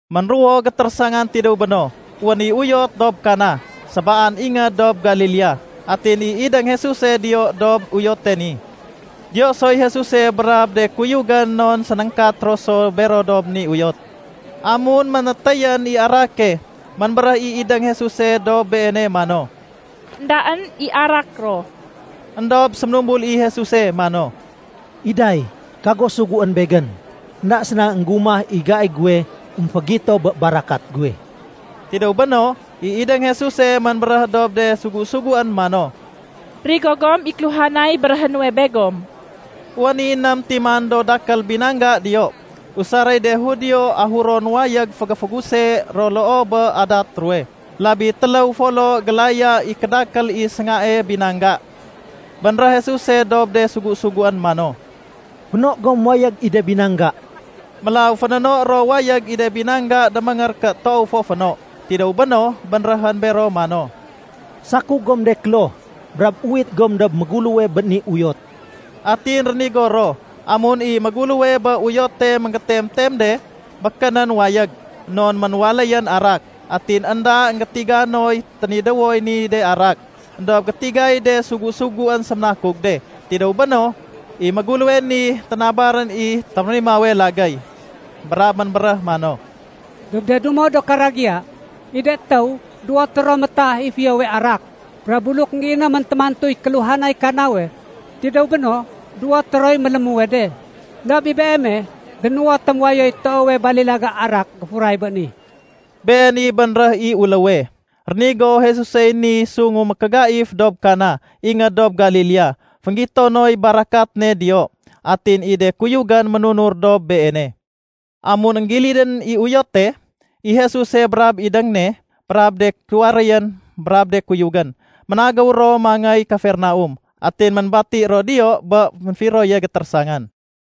Ménruwo gétérésangan tidéw béno, wén i uyot dob Kana, sébaan ingéd dob Galilea. Atin i idéng Jesuse diyo dob uyote ni. Diyo soy Jesuse brab de kuyugén non sénéngkat ro so bero dob ni uyot. Amun ménétéyén i arake, ménbéréh i idéng Jesuse dob Beene mano, “Endaén i arak ro.” Endob séménumbul i Jesuse mano, “Iday, kago suguén Begén. Enda séna énggumah i gai guwe émfégito bé barakat guwe.” Tidéw béno, i idéng Jesuse ménbéréh dob de sugu-suguén mano, “Rigo gom i kéluhanay béréhé nuwe begom.” Wén i ném timan do dakél binangga diyo, usaréy de Judio ahuron wayég fégéféguse ro loo bé adat ruwe. (Labi téléw folo gélaya i kédakél i séngae binangga.) Bénréh Jesuse dob de sugu-suguén mano, “Féno gom wayég i de binangga.” Mélaw fénéno ro wayég i de binangga déméngér ké toow fo féno. Tidéw béno, bénréhén bero mano, “Sakug gom de kloh, brab uwit gom dob méguléwe bé ni uyot.” Atin rénigo ro. Amun i méguléwe bé uyote ménggétemtem de, békénén wayég, non ménwaléyén arak. Atin énda énggétiga noy ténidéwoy ni de arak. Endob gétigay de sugu-suguén séménakug de. Tidéw béno, i méguléwe ni ténabarén i témérimawe lagéy. Brab ménbéréh mano, “Dob de dumo do karagiya, i de étéw duwoté ro métah i fiyowe arak, brab buluk énggéinémén témantuy kéluhanay kanawe, tidéw béno duwoté roy mélémuwe de. Endob i beeme dénuwotém wayoy toowe balilaga arak géfuray béni!” Been i bénréh i uléwe. Rénigo Jesusey ni sungu mékégaif dob Kana, ingéd dob Galilea. Fénggito noy barakat ne diyo, atin i de kuyugén ménunur dob Beene. Amun énggilidén i uyote, i Jesuse brab idéng ne, brab de tuwaréyén, brab de kuyugén, ménagéw ro mangéy Kapernaum. Atin ménbati ro diyo bé ménfiroye gétérésangan.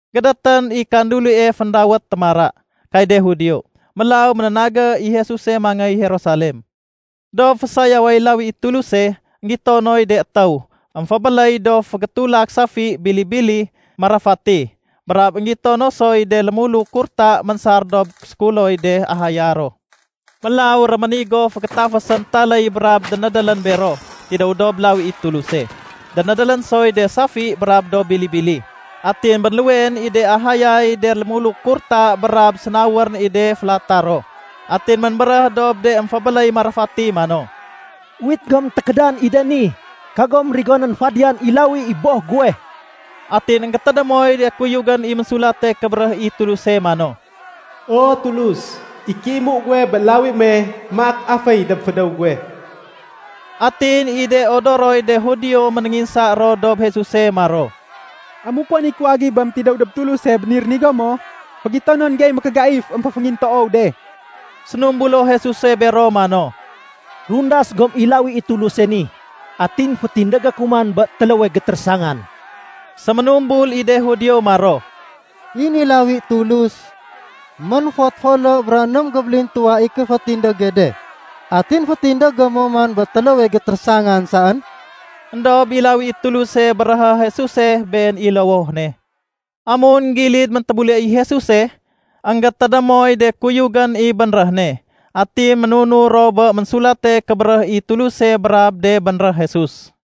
Gédétén i kandulie féndawét “Témara” kay de Judio, mélaw ménénagé i Jesuse mangéy Jerusalem. Dob fésayaway lawi i Tuluse, énggito noy de étéw émfébéléy do fégétulak safi, bili-bili, marafati. Brab énggito no soy de lémuluk kurta ménsar dob sékuloy de ahaya ro. Mélaw réménigo fégétafésén taléy brab dénédélén bero tidéw dob lawi i Tuluse. Dénédélén soy de safi brab do bili-bili. Atin bénluweén i de ahayay de lémuluk kurta brab sénawarén i de félatah ro. Atin ménbéréh dob de émfébéléy marafati mano, “Uwit gom tékédan i de ni. Kagom rigonén fadiyan i lawi i Boh guwe!” Atin énggétédémoy de kuyugén i Ménsulate Kébéréh i Tuluse mano, “O Tulus, i kéimu guwe bé lawi me, maak aféy dob fédéw guwe.” Atin i de odoroy de Judio ménénginsa ro dob Jesuse maro, “Amuk wén i kuwagibém tidéw dob Tuluse bé ni rénigo mo, fégitonon gey mékégaif émféféngintoow de.” Sénumbulo Jesuse bero mano, “Rundas gom i lawi i Tuluse ni, atin fétindégé ku man bé téléwe gétérésangan.” Séménumbul i de Judio maro, “I ni lawi Tulus, mén-fot folo bra ném gébélintuwa i kéfétindége de, atin fétindégé mo man bé téléwe gétérésangan saén?” Endob i lawi i Tuluse béréhé Jesuse, been i lowoh ne. Amun gilid méntébule i Jesuse, énggétédémoy de kuyugén i bénréh ne. Atin ménunur ro bé Ménsulate Kébéréh i Tuluse brab de bénréh Jesus.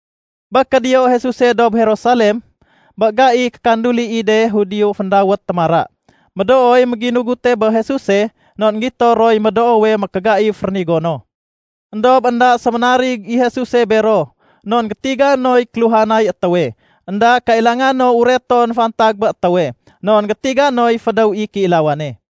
Bé kédiyo Jesuse dob Jerusalem, bé gaiy kékanduli i de Judio féndawét “Témara”, médooy méngginugute bé Jesuse non énggito roy médoowe mékégaif rénigo no. Endob énda séménarig i Jesuse bero non gétiga noy kéluhanay étéwe. Enda kailanga no ureton fantag bé étéwe non gétiga noy fédéw i kéilawane.